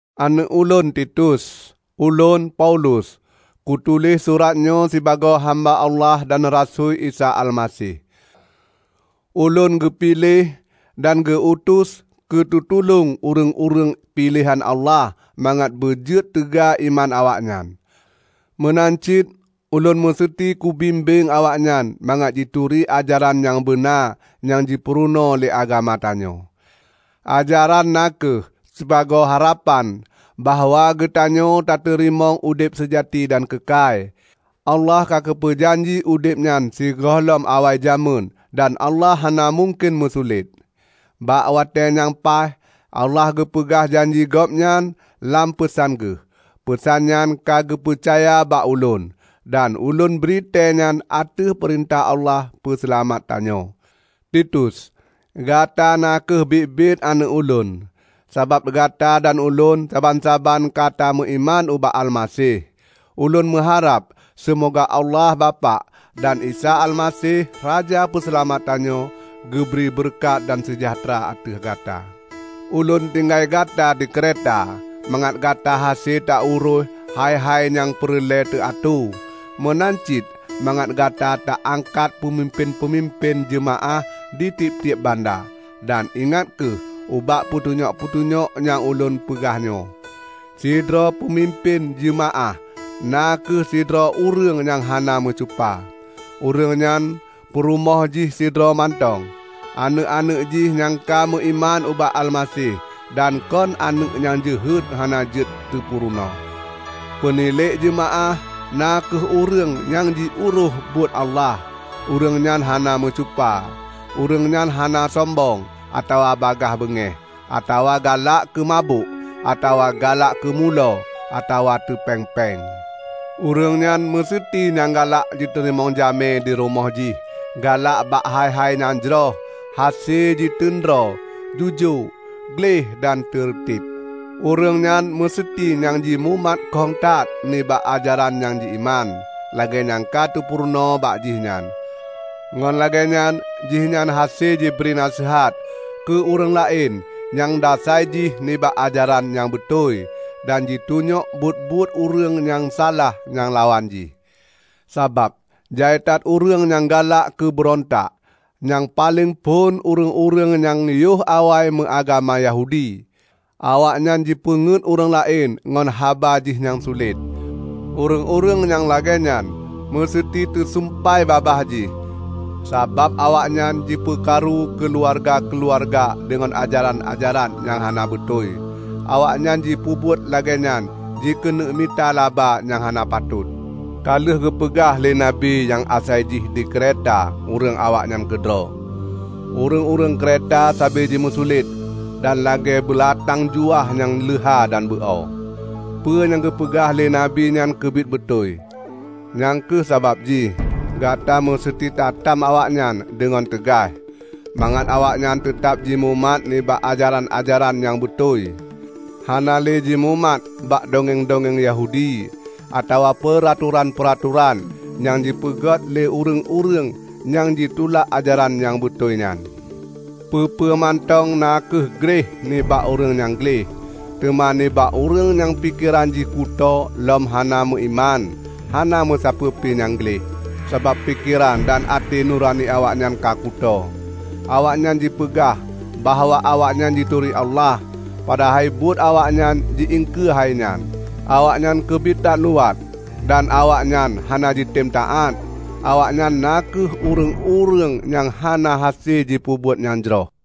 Aneuëk ulôn Titus! Ulôn, Paulus, kutuléh surat nyoe sibagoe hamba Allah dan rasui Isa Almaseh. Ulôn geupiléh dan geu-utus keu teutulông ureuëng-ureuëng piléhan Allah mangat beujeuet teuga iman awaknyan. Meunan cit ulôn museuti kubimbéng awaknyan mangat jituri ajaran nyang beuna nyang jipeurunoe lé agama tanyoe. Ajaran na kheueh sibagoe harapan bahwa geutanyoe tateurimong udeb seujati dan keukai. Allah ka geupeu janji udeb nyan sigohlom awai jamén -- dan Allah hana mungken meusulet. Bak watée nyang paih, Allah geupeugah janji Gobnyan nyan lam peusan Geuh. Peusan nyan ka geupeucaya bak ulôn, dan ulôn britée nyan ateueh peurintah Allah Peuseulamat tanyoe. Titus, gata na kheueh biet-biet aneuëk ulôn, sabab gata dan ulôn saban-saban kata meuiman ubak Almaseh. Ulôn meuharab seumoga Allah Bapak dan Isa Almaseh Raja Peuseulamat tanyoe, geubri beureukat dan seujahteura ateueh gata. Ulôn tinggai gata di Kreta mangat gata hase tauroih hai-hai nyang peureulée teuatoe. Meunan cit, mangat gata ta angkat peumimpén-peumimpén jeumaáh ditieb-tieb banda. Dan ingat kheueh ubak peutunyok-peutunyok nyang ulôn peugah nyoe: Sidroe peupeumimpén jeumaáh na kheueh sidroe ureuëng nyang hana meucupa; ureuëng nyan peurumoh jih sidroe mantong; aneuëk-aneuëk jih nyang ka meuiman ubak Almaseh dan kon aneuëk nyang jeuhet hana jeuet teupurunoe. Peunilék jeumaáh na kheueh ureuëng nyang jiurôih buet Allah, ureuëng nyan hana meucupa. Ureuëng nyan hana sombong atawa bagaih beungéh, atawa galak keumabök, atawa galak keumulo, atawa teupéng-péng. Ureuëng nyan meuseuti nyang galak jiteurimong jamé dirumoh jih, galak bak hai-hai nyang jroh, hase jiteun droe, jujoe, gleh dan teureuteb. Ureuëng nyan meuseuti nyang jimumat kong that nibak ajaran nyang ji-iman, lagée nyang ka teupurunoe bak jih nyan. Ngon lagée nyan jihnyan hase jibri naseuhat keu ureuëng laén nyang dasai jih nibak ajaran nyang beutôi, dan jitunyok buet-buet ureuëng nyang salah nyang lawan jih. Sabab jai that ureuëng nyang galak keubeurontak, nyang paleng phon ureuëng-ureuëng nyang yoh awai meuagama Yahudi; awaknyan jipeunget ureuëng laén ngon haba jih nyang sulet. Ureuëng-ureuëng nyang lagée nyan meuseuti teusumpai babah jih, sabab awaknyan jipeukaru keuluwarga-keuluwarga deungon ajaran-ajaran nyang hana beutôi. Awaknyan jipeubuet lagée nyan jikeuneuk mita laba nyang hana patot! Ka lheueh geupeugah lé nabi nyang asai jih di Kreta ureuëng awaknyan keudroe, "Ureuëng-ureuëng Kreta sabe jimeusulet, dan lagée beulatang juwah nyang leuha dan beu-o." Peue nyang geupeugah lé nabi nyan keubiet beutôi. Nyang kheueh sabab jih gata meuseuti tatam awaknyan deungon teugaih; mangat awaknyan teutab jimumat nibak ajaran-ajaran nyang beutôi hana lé jimumat bak dongeng-dongeng Yahudi atawa peuratoran-peuratoran nyang jipeuget lé ureuëng-ureuëng nyang tulak ajaran nyang beutôi nyan. Peue-peue mantong na kheueh gleh nibak ureuëng nyang gleh. Teuma nibak ureuëng nyang pikeran jih kutoe lom hana meuiman, hana meusapeue pi nyang gleh, sabab pikeran dan até nurani awaknyan ka kutoe! Awaknyan jipeugah bahwa awaknyan jituri Allah, padahai buet awaknyan ji iengkeue hai nyan. Awaknyan keubiet that luwat, dan awaknyan hana jitem taát; awaknyan na kheueh ureuëng-ureuëng nyang hana hase jipeubuet nyang jroh.